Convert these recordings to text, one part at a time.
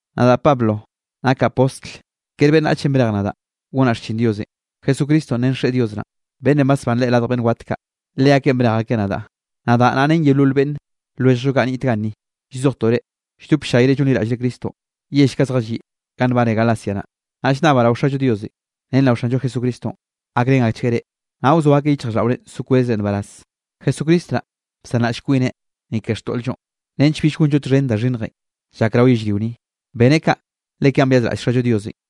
Nadaꞌ Pablo nakaꞌ postl, kere beꞌnnachenꞌ brej nadaꞌ gonaꞌ xchin Diosenꞌ, Jesucristonꞌ ren Xeꞌe Dios naꞌn, beꞌnnenꞌ basbán Leꞌe radj beꞌnn wat kaꞌ, leakeꞌn brej akeꞌ nadaꞌ. Nadaꞌ naꞌ ren yeolol beꞌnn lwelljllo kaꞌ niꞌt ganni, llzojtoꞌ reꞌ lldop ll-llayre llonliraꞌllre Cristonꞌ yell kaꞌ zjalliꞌ ganꞌ nbane Galacia naꞌ. Naꞌ llnnabaꞌ rao Xallo Diosenꞌ ren rao Xanllo Jesucristonꞌ gakrén akchgueꞌ reꞌ, naꞌ wzoa akeꞌ yichjraꞌlldaꞌore so kwezre nbaraz. Jesucristo naꞌ bsanraꞌll kwineꞌ, ni ke xtoꞌl-llonꞌ nench bill gonllo txhen da xhinnjenꞌ llak rao yellrio ni. Beneꞌ kaꞌ le kaꞌn byazraꞌll Xallo Diosenꞌ,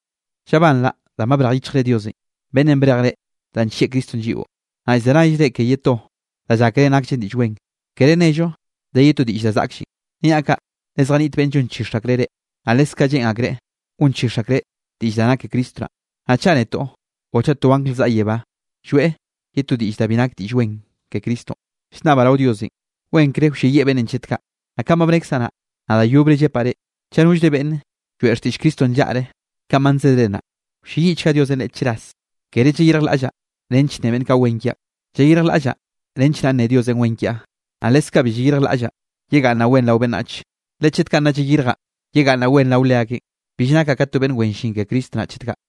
Llabanraꞌ danꞌ ba brej yichjre Diosenꞌ, beꞌnnenꞌ brej reꞌ danꞌ nllieꞌ Cristonꞌ lliꞌo, naꞌ llzenayre ke ye to da llákere nakllen diꞌll wen. Kere nello de ye to diꞌll da zaꞌkllenꞌ. Niaꞌ kaꞌ le zjaniꞌt beꞌnn llonchix akreꞌ reꞌ, naꞌ leskaꞌ lleꞌn akreꞌ gonchix akreꞌ diꞌll da nak ke Cristo naꞌ. Naꞌ chaꞌ netoꞌ o chaꞌ to angl zaꞌa yebá, lloeꞌ ye to diꞌll da bi nak Diꞌll Wen ke Cristonꞌ, llnnabaꞌ rao Diosenꞌ, wenkre wlleyieꞌ beꞌnnenꞌ chet kaꞌ. Naꞌ kanꞌ ba bnekzaꞌ naꞌ, naꞌ da yobre llepaꞌ reꞌ, chaꞌ nollre beꞌnne lloeꞌ xtiꞌll Cristonꞌ nllaꞌre kanꞌ ba nsedre naꞌ, wlleyiꞌchga Diosenꞌ leꞌe chras. Kere llayirjlaꞌllaꞌ nench nne beꞌnn kaꞌ wen kiaꞌn. Llayirjlaꞌllaꞌ nench naꞌ nne Diosenꞌ wen kiaꞌ, naꞌ leskaꞌ bi llayirjlaꞌllaꞌ yegaꞌnnaꞌ wen rao beꞌnnachenꞌ, le chet kaꞌ nnaꞌ llayirjaꞌ yegaꞌnnaꞌ wen rao leakeꞌn, bill nakaꞌ ka to beꞌnn wen llin ke Cristo naꞌ chet kaꞌ.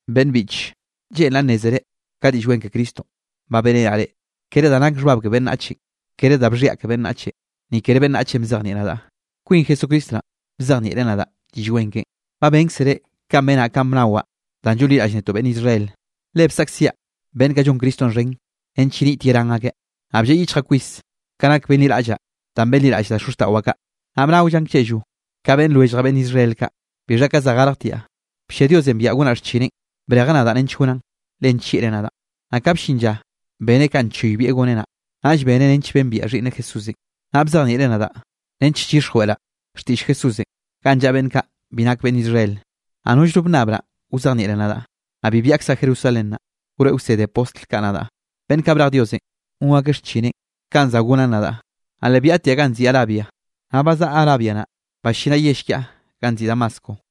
Beꞌnn biꞌche, lleꞌnraꞌ nnézere ka Diꞌll Wen ke Cristonꞌ ba beꞌrenaꞌ reꞌ, kere da nake xhbab ke beꞌnnachenꞌ. Kere da bxhiaꞌ ke beꞌnnachenꞌ, ni kere beꞌnnachenꞌ bzejnieꞌ nadaꞌ, kwin Jesucristo naꞌn bzejnieꞌreꞌ nadaꞌ Diꞌll Wen keꞌen. Ba bénkzere kanꞌ benaꞌn kanꞌ bnawaꞌ danꞌ llonliraꞌll netoꞌ beꞌnn Israel. Le bsaꞌkziaꞌ beꞌnn kaꞌ llon Cristonꞌ xhen nench yenit yerán akeꞌ. Naꞌ blleꞌ yichjaꞌ kwis ka nak benliraꞌllaꞌ danꞌ benliraꞌll da xozxtaꞌwaꞌ kaꞌ, naꞌ bnaollaꞌn klleꞌllo ka beꞌnn lwelljaꞌ beꞌnn Israel kaꞌ. Bixha ka za garjtiaꞌ, bllia Diosenꞌ biaꞌa gonaꞌ xchineꞌn. Brejeꞌ nadaꞌ nench gonaꞌn, le nllieꞌreꞌ nadaꞌn. Naꞌ ka bllin lla beneꞌ kanꞌ nchoybieꞌ goneꞌ naꞌ, naꞌll beneꞌ nench bembiaꞌ Xhiꞌnneꞌ Jesúsenꞌ, naꞌ bzejnieꞌreꞌ nadaꞌ nench llyixjweꞌraꞌ xtiꞌll Jesúsenꞌ ganꞌ llaꞌa beꞌnn kaꞌ bi nak beꞌnn Israel. Naꞌ nollno bnnabraꞌ wzejnieꞌreꞌ nadaꞌ. Naꞌ bi byaꞌkzaꞌ Jerusalén naꞌ, wroeꞌ wsede postl kaꞌ nadaꞌ, beꞌnn kaꞌ brej Diosenꞌ gon akeꞌ xchineꞌn kanꞌ za gonaꞌn nadaꞌ. Naꞌ le byaꞌtiaꞌ ganꞌ nziꞌi Arabia, naꞌ bazaꞌa Arabia naꞌ ballinaꞌ yell kiaꞌ ganꞌ nziꞌi Damasco.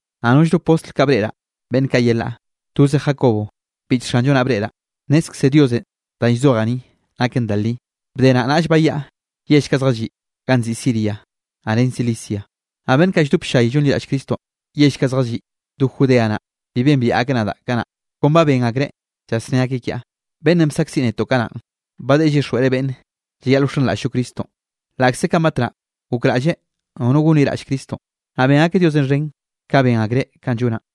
Naꞌ nollno postl kaꞌ breꞌraꞌ beꞌnn kaꞌ yelaꞌ, toze Jacobo biꞌch Xanllo naꞌ breꞌraꞌ. Nnezkze Diosenꞌ danꞌ llzojaꞌ ni, naken da li. Bde naꞌ naꞌll bayaꞌa yell kaꞌ zjalliꞌ ganꞌ nziꞌi Siria naꞌ ren Cilicia. Naꞌ beꞌnn kaꞌ lldop ll-llay llonliraꞌll Cristonꞌ yell kaꞌ zjalliꞌ do Judea naꞌ, bi bembiaꞌ akeꞌ nadaꞌ kanaꞌ. Kon ba ben akreꞌ llasné akeꞌ kiaꞌ: “Beꞌnnenꞌ bsaꞌkziꞌ netoꞌ kanaꞌn, ba deꞌe llyixjweꞌreꞌ beꞌnne llayaꞌl wxenraꞌll-llo Cristonꞌ, laꞌkze kanꞌ batnaꞌ gokraꞌlleꞌ nono gonliraꞌll Cristonꞌ.” Naꞌ ben akeꞌ Diosenꞌ xhen, ka ben akreꞌ kanꞌ llonaꞌn.